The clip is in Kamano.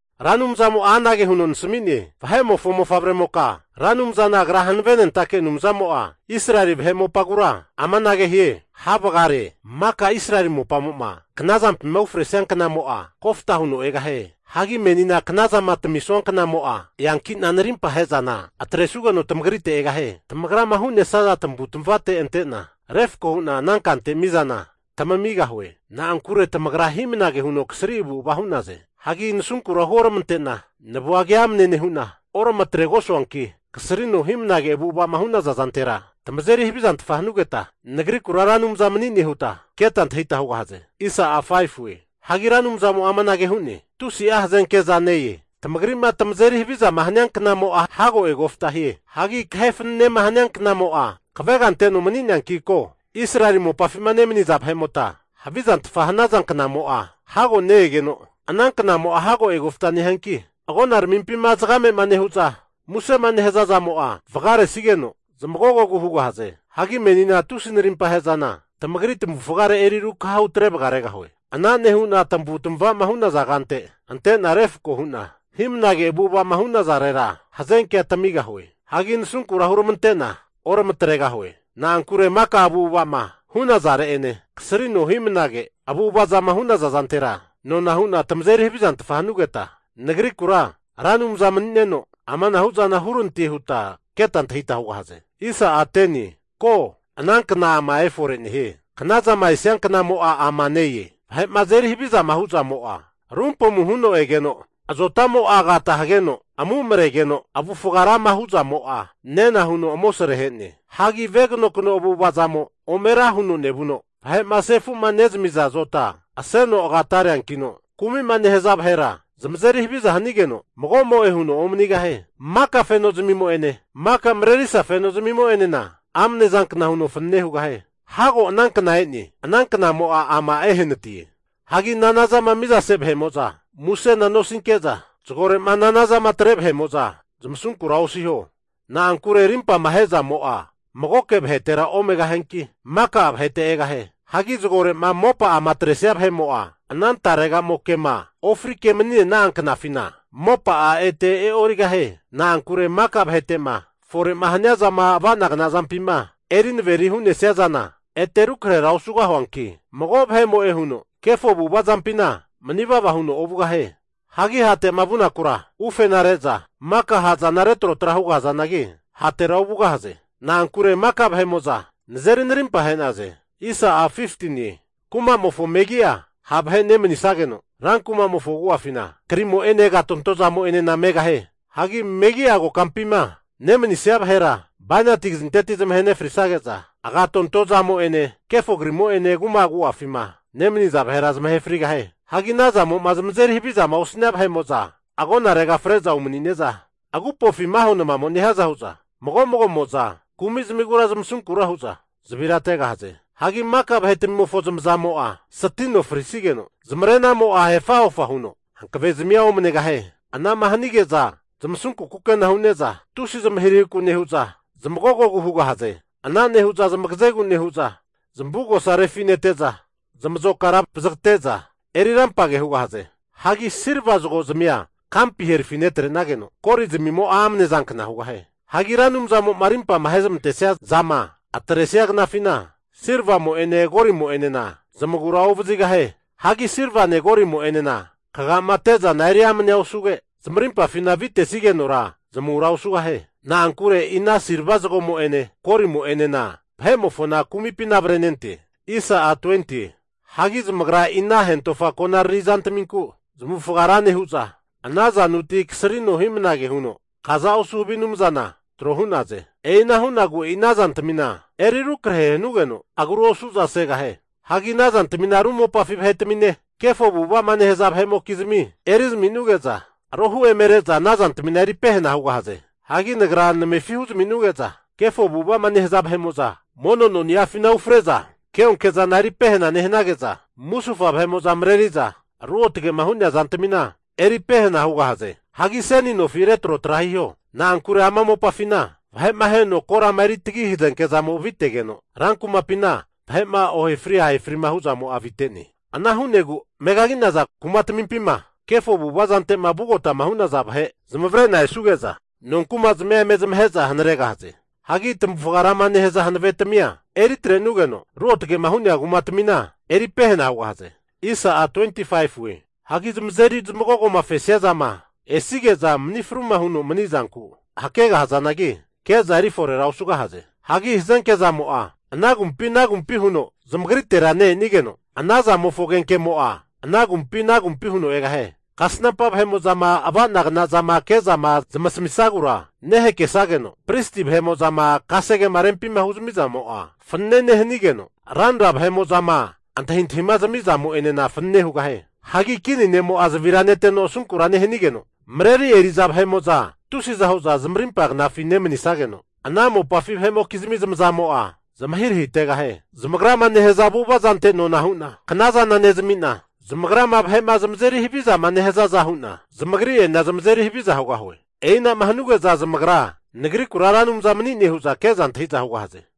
Ra Anumzamo'a anage huno nasami'ne, Vahe'mofo mofavremoka, Ra Anumzana Agra hanavenentake Anumzamo'a Israeli vahe mopagura amanage hie, Ha' vagare! Maka Israeli mopamo'ma knazampima ufresia knamo'a kofta huno egahie. Hagi menina knazama tamisua knamo'a, eankina narimpama ahe'zana atresugeno tamagrite egahie. Tamagrama hu'nesaza tamavu tamavate antena refako hu'na ana kante mizana tamamigahue. Na'ankure tamagra hi'mnage huno kasri avu'ava hu'naze. Hagi nasunkura huoramante'na ne vua keamne nehu'na oramatregosuanki, kasrino hi'mnage avu'avazama hu'naza zantera tamazeri havizantfa hanugeta, Nagrikura Ra Anumza mani'ne huta keta antahita hugahaze. Hagi Ra Anumzamo'a amanage hu'ne, Tusi'a hazenke'za ne-e. Tamagri'ma tamazeri havizama hania knamo'a hago eankino, hago egofta hie. Hagi kahe fananema hania knamo'a, kavega anteno mani'neanki ko. Israeli mopafima nemaniza vahe'mota havizantfa hanaza knamo'a hago ne-egeno, ana knamo'a hago egofta nehianki, agonaramimpina zagame'ma nehu'za musema nehaza zamo'a vagaresigeno, zamagogogu hugahaze. Hagi menina tusi'a narimpa ahe'zana tamagri tamavufgare eri rukaha hutre vagaregahue. Ana nehu'na tamavu tamava'ma hu'naza kante antena refko hu'na hi'mnage avu'ava'ma hu'nazarera hazenkea tamigahue. Hagi nasunkura huramante'na oramatregahue. Na'ankure maka avu'ava'ma hu'nazare'ene kasrino hi'mnage avu'avazama hu'naza zantera nona hu'na tamazeri havizantfa hanugeta Nagrikura Ra Anumza mani'neno amanahu zana hurante huta keta antahita hugahaze. Ko, anankna ama efore nehie! Knazama esia knamo'a ama ne-e! Vahe'ma azeri havizama huzamo'a rumpamu huno egeno, azotamo'a agata hageno amu'maregeno, avufga rama hu'zamo'a nena huno amosre ahe'ne. Hagi veganokno avu'avazamo ome ra huno nevuno vahe'ma sefu'ma nezamiza azota aseno agatareankino kumima nehaza vahera zamazeri haviza hanigeno, mago'mo'e huno omanigahie. Maka fenozmimo'ene maka marerisa fenozmimo'enena amne zankna huno fanane hugahie. Hago ana kna e'ne, ana knamo'a ama ehanatie. Hagi nanazama mizase vahe'mo'za musena nosinke'za, zagore'ma nanazama atre vahe'mo'za zamasunkura osiho. Na'ankure rimpama ahe'zamo'a magoke vahetera omegahianki, maka'a vahete egahie. Hagi zagore'ma mopa'ama atresia vahe'mo'a, ana tarega'mokema ofrike mani'nena'a knafina mopa'a ete e'origahie. Na'ankure maka vahete'ma fore'ma hania zama ava'nagna zampima eri averi'ma hu'nesia zana ete rukrahera osugahiankino, mago vahe'mo'e huno kefo avu'avazampina mani vava huno ovugahie. Hagi hate'ma vunakura ufena re'za mika ha' zana retrotra hugahazanagi, hatera ovugahaze. Na'ankure maka vahe'mo'za nazeri narimpa ahe'naze. Kumamofo megi'a ha' vahe nemanisageno, ran kumamofo agu'afina krimo'ene agatonto zamo'enena megahie. Hagi megi'a kokampima nemanisia vahera bainati kazinteti zamahe nefrisage'za, agatonto zamo'ene, kefo krimo'ene kuma agu'afima nemaniza vahera zamahe frigahie. Hagi ana zamo'ma zamazeri havizama osnia vahe'mo'za agonarega fre'za umani'neza, agupofi maho namamo'ma nehiaza hu'za mago magomo'za kumi zamigura zamasunkura hu'za zavira ategahaze. Hagi maka vahetmimofo zamazamo'a satino frisigeno, zamarenamo'a hefa hofa huno hankavezmia omanegahie. Anama hanige'za zamasunku kukena hu'neza tusi zmahirahiku nehu'za zamagogogu hugahaze. Ana nehu'za zamagazegu nehu'za zamavugosa refinete'za, zamazokara vazagate'za eri rampage hugahaze. Hagi silva zagozmia kampi herafi netre'nageno, golizmimo'a amne zankna hugahie. Hagi Ra Anumzamo'ma arimpama ahe'zamantesia zama atresigeno esia knafina, silvamo'ene golimo'enena zamagura ovazigahie. Hagi silvane golimo'enena kaga'ma ate'zana eri amne osuge, zamarimpafina avitesigenora zamura osugahie. Na'ankure e'i ana silva zagomo'ene golimo'enena vahe'mofona kumipina avrenente. Hagi zamagra e'i ana hentofa konariri zantminku zamavufaga ra nehu'za, ana zanuti kasrino hi'mnage huno kaza osu havi anumzana trohu'naze. E'ina hu'negu e'i ana zantamina eri arukrahe hanugeno, agru osu'za segahie. Hagi ana zantamina ru mopafi vahetamine, kefo avu'ava'ma nehaza vahe'mokizmi eri zami'nuge'za, rohu emere'za ana zantamina eri pehana hugahaze. Hagi Nagra namefi huzmi'nuge'za kefo avu'ava'ma nehaza vahe'mo'za mono noni'afina ufre'za keonke zana eri pehana nehanageza, musufa vahe'mo'za mareri'za ruotge'ma hu'nea zantamina eri pehena hugahaze. Hagi seni nofi retrotra hiho. Na'ankure ama mopafina vahe'ma aheno korama eri tagi hazenke zamo avitegeno, rankumapina vahe'ma ohefri ahefri hu'zamo'a avite'ne. Ana hu'negu megagi'naza kumatmimpima kefo avu'ava zante'ma vugotama hu'naza vahe zamavare'na esuge'za, nonkumazmia eme zamahe'za hanaregahaze. Hagi tamavufga rama nehaza hanavetamia eri atrenugeno, ruotge'ma hu'nea kumatamina eri pehena hugahaze. Hagi zamazeri zamagogoma fesia zama esige'za mani fruma huno mani'zanku hakegahazanagi, ke'za eri forera osugahaze. Hagi hazenke zamo'a ana agumpi ana agumpi huno zamagritera ne-enigeno, ana zamofo agenkemo'a ana agumpi ana agumpi huno egahie. Kasnampa vahe'mo'zama ava'nagna zama ke'zama zamasamisagura nehakesageno, pristi vahe'mo'zama kasegema rempi huzmi'zamo'a fanane nehanigeno, ranra vahe'mo'zama antahintahima zami'zamo'enena fanane hugahie. Hagi kini ne'mo'a zavira neteno asunkura nehanigeno, mareri eri'za vahe'amo'za tusiza hu'za zamarimpa knafi nemanisageno, ana mopafi vahe'mokizmi zamazamo'a zamahirahitegahie. Zamagrama nehaza avu'avazante nona hu'na knazana nezami'na, zamagrama vahe'ma zamazeri havizama nehazaza hu'na, zamagri'enena zamazeri haviza hugahue. E'inama hanuge'za zamagra Nagrikura Ra Anumza mani'ne huza ke'za antahi'za hugahaze.